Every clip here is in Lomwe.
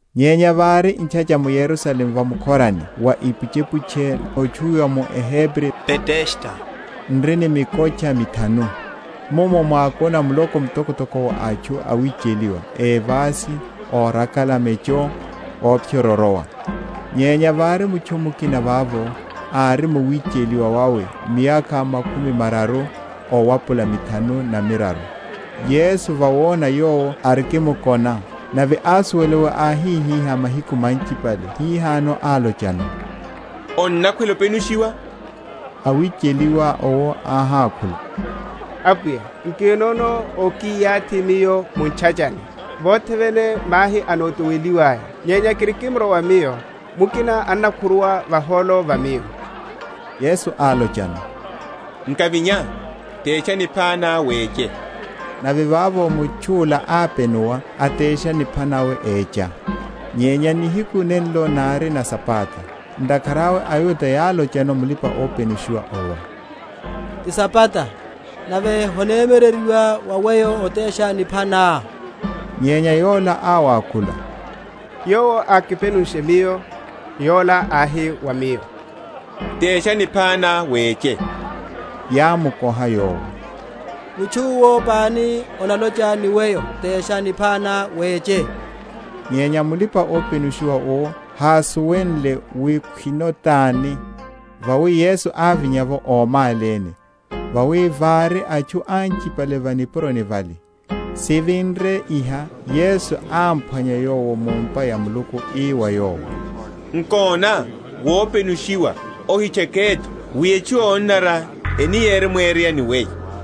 Nyenya vári ntchacha m’Yerusalemu va mukhorani wa ipuchepuche, notchuwiwa mu eHebri Betesda, n’ri ni mikotcha mithanu. Mummo mwákona muloko mtokotoko wa atchu awicheliwa, évasi, órakala mecho, óphyórorowa. Nyenya vári mutchu mukina vavo, ári mu wicheliwa wawe miyakha makhumi mararu owapula mithanu na miraru. Yesu, vawona yowo arikimkona, nave ásuwela wi áhihihá mahiku manchipale hihano, álochano, Onnakhwela openushiwa? Awicheliwa owo áhákhula, Apwiya, nkinono ókiyathi miyo mu’tchachani, vothe vene mahi anotoweliwaya; nyenya kirikimorwa miyo, mukina annakhuruwa vahólo va miyo. Yesu álochano, Nkavinya, tesha nipha ná, weche. Nave vavo mutchu’la ápenuwa, atesha nipha nawe, écha. Nyenya nihiku nenlo nári na Sabata. Ntakhara awe aYuda yálochano mulipa‐openushiwa owo, Ti Sabata, nave honemyereryiwa wa weyo otesha nipha ná. Nyenya yola áwakhula, Yowo ákipenunshe miyo, yola áhi wa miyo, Tesha nipha ná, weche. Yámukoha yowo, Mutchu’wo pani ólocha ni weyo, Tesha nipha ná, weche? Nyenya mulipa‐openushiwa owo hásuwenle wi khwino tani; vawi Yesu ávinya’vo ómáléne, vawi vári atchu anchipale va nipuroni vale. Sivinre iha Yesu ámphwanya yowo mu’mpa ya Muluku, ii wa yowo, Nkona, wopenushiwa; ohitcheke’tho, wi etchu yonanara eni yeremwereya ni weyo.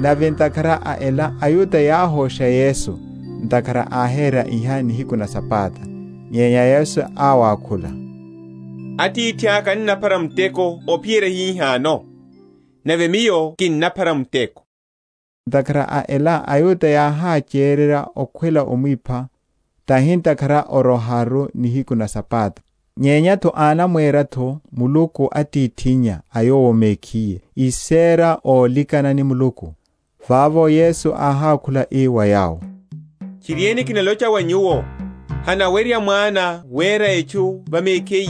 Nave ntakhara a ela aYuda yáhosha Yesu, ntakhara áhera iha nihiku na Sabata. Nyenya Yesu áwakhula, Atithaka annaphara muteko ophiyerya hihano, nave Miyo kinnaphara muteko. Ntakhara a ela aYuda yáhachererya okhwela omwipha, tahi ntakhara oroharu nihiku na Sabata, nyenya’tho anamwera’tho Muluku Atithinnya a Yowo mekhiye; ísera ólikana ni Muluku. Vavo Yesu áhákhula ii wa yawo, Tchiriene, kinalocha wa nyuwo, Hanawerya Mwana wera etchu va mekhiye,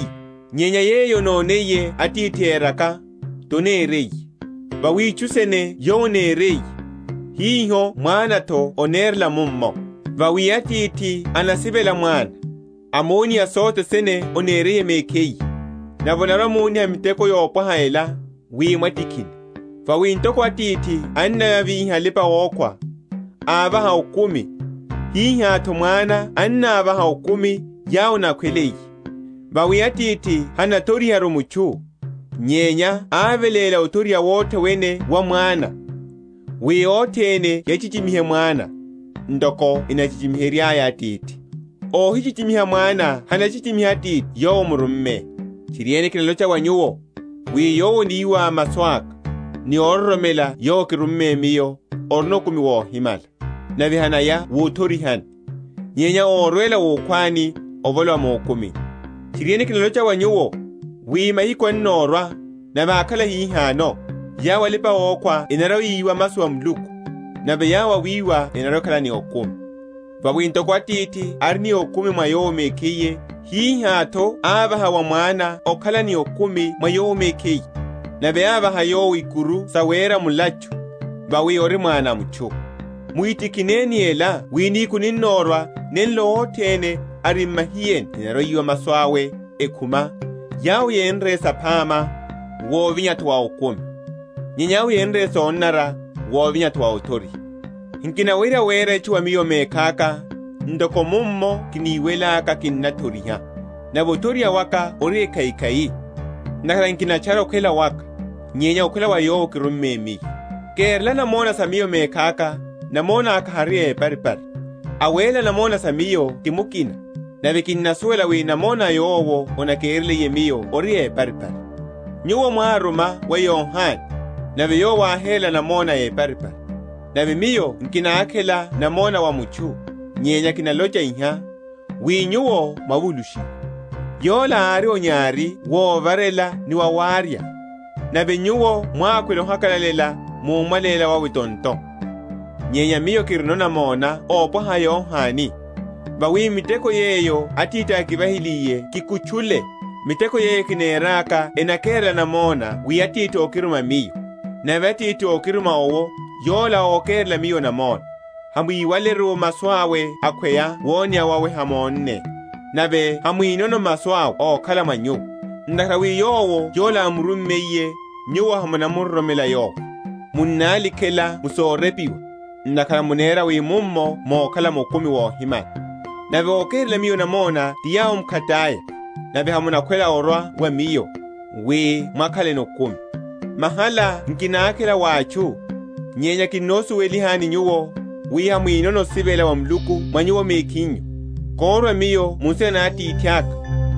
nyenya yeyo anoniye Atithi éraka, taneriye. Vawi itchu sene Yowo aneriye, hiho Mwana’tho anerela mummo. Vawi Atithi anasivela Mwana, amoniha sothe sene aneriye mekhiye: nave anarwa‐amoniha miteko yopwaha ela, wi mwatikhine. Vawi ntoko Atithi annavíha alipa‐okhwa, ávaha okumi, hihátho Mwana annavaha okumi yawo anakhweliye. Vawi Atithi hanathoriharu mutchu, nyenya áveléla othoriha wothe wene wa Mwana, wi othene yachichimihe Mwana, ntoko enachichimiheryaya Atithi. Óhichichimiha Mwana hanachichimiha Atithi Yowo ámurumme. Tchiriene, kinalocha wa nyuwo, wi yowo aniwa masu aka, ni ororomela Yowo ákirumme Miyo, orino okumi wohimala, nave hanaya wuthorihani, nyenya órwela wukhwani, avolowa mukumini. Tchiriene, kinalocha wa nyuwo, wi mahiku annorwa, nave ákhala hihano, yawo alipa‐okhwa enarwa‐yiwa masu a Muluku; nave yawo awiwa enarwa‐ekhala ni okumi. Vawi ntoko Atithi ari ni okumi mwa Yowo mekhiye, hihá’tho ávaha wa Mwana okhala ni okumi mwa Yowo mekhiye; nave ámvaha yowo ikuru sawera mulachu, vawi ori Mwana a mutchu. Muhitikhine ni ela wi nihiku ninnorwa, nenlo othene ari m’mahiyeni enarwa‐yiwa masu awe, ekhuma, yawo yénre saphama, wuvinya’tho wa okumi; nyenya yawo yénre sonanara, wuvinya’tho wa othoriha. Nkinawerya wera etchu wa Miyo mekhaka: ntoko mummo kiniwelaka kinnathoriha; nave othoriha waka ori ekhaikhai; ntakhara nkinatchara okhwela waka, nyenya okhwela wa Yowo ókiruma Miyo. Kérela namona sa Miyo mekhaka, namona aka hari éparipari. Awerela namona sa Miyo ti mukina; nave kinnasuwela wi namona yowo anakereliye Miyo ori éparipari. Nyuwo mwáruma wa Yohane, nave yowo áherela namona éparipari. Nave Miyo nkinakhela namona wa mutchu: nyenya kinalocha iha, wi nyuwo mwavulushiwe. Yola ári onyari wovarela ni wawarya; nave nyuwo mwákhwela ohakalalela mu omwaléla wawe tonto. Nyenya Miyo kirino namona ópwaha a Yohane: vawi miteko yeyo Atithi ákivahiliye kikutchule, miteko yeyo kineraka enakerela namona, wi Atithi ókiruma Miyo. Nave Atithi ókiruma owo, Yola ókerela Miyo namona. Hamwíwaleru masu awe akhweya woneya wawe hamónne. Nave hamwinono masu awe ókhala mwa nyuwo; ntakhara wi yowo Yola ámurummiye, nyuwo hamunamuroromela Yowo. Munnálikhela mu sorepiwa, ntakhara munera wi mummo mokhalano okumi wohimala; nave ókerela Miyo namona ti yawo mkhataya; nave hamunakhwela orwa wa Miyo, wi mwakhaleno okumi. Mahala nkinakhela wa atchu. Nyenya kinnosuwelani nyuwo, wi hamwinono osivela wa Muluku mwa nyuwo mekhinyu. Korwa Miyo mu nsina na Atithaka,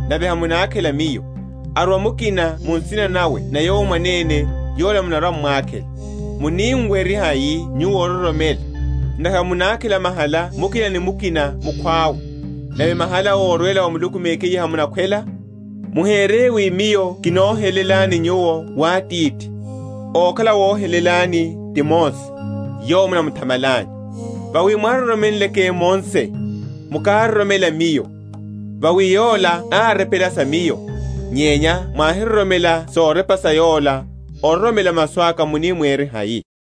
nave hamunakakhela Miyo: arwa mukina mu nsina nawe na yowo mwanene, yola munarwa‐m’mwakhela. Muni muwerye hai nyuwo ororomela, ntakhara munakhela mahala mukina ni mukina mukhwawe; nave mahala órwela wa Muluku mekhiye hamunakhwela? Muhere wi Miyo kinohelelani nyuwo wa Atithi: okhala awohelelani, ti Mose, yowo munamuthamalanyu. Vawi mwároromenleke Mose, mukároromela Miyo; vawi yola árepela sa Miyo. Nyenya mwáhiroromela sorepa sa yola, ororomela masu aka muni mwerehai?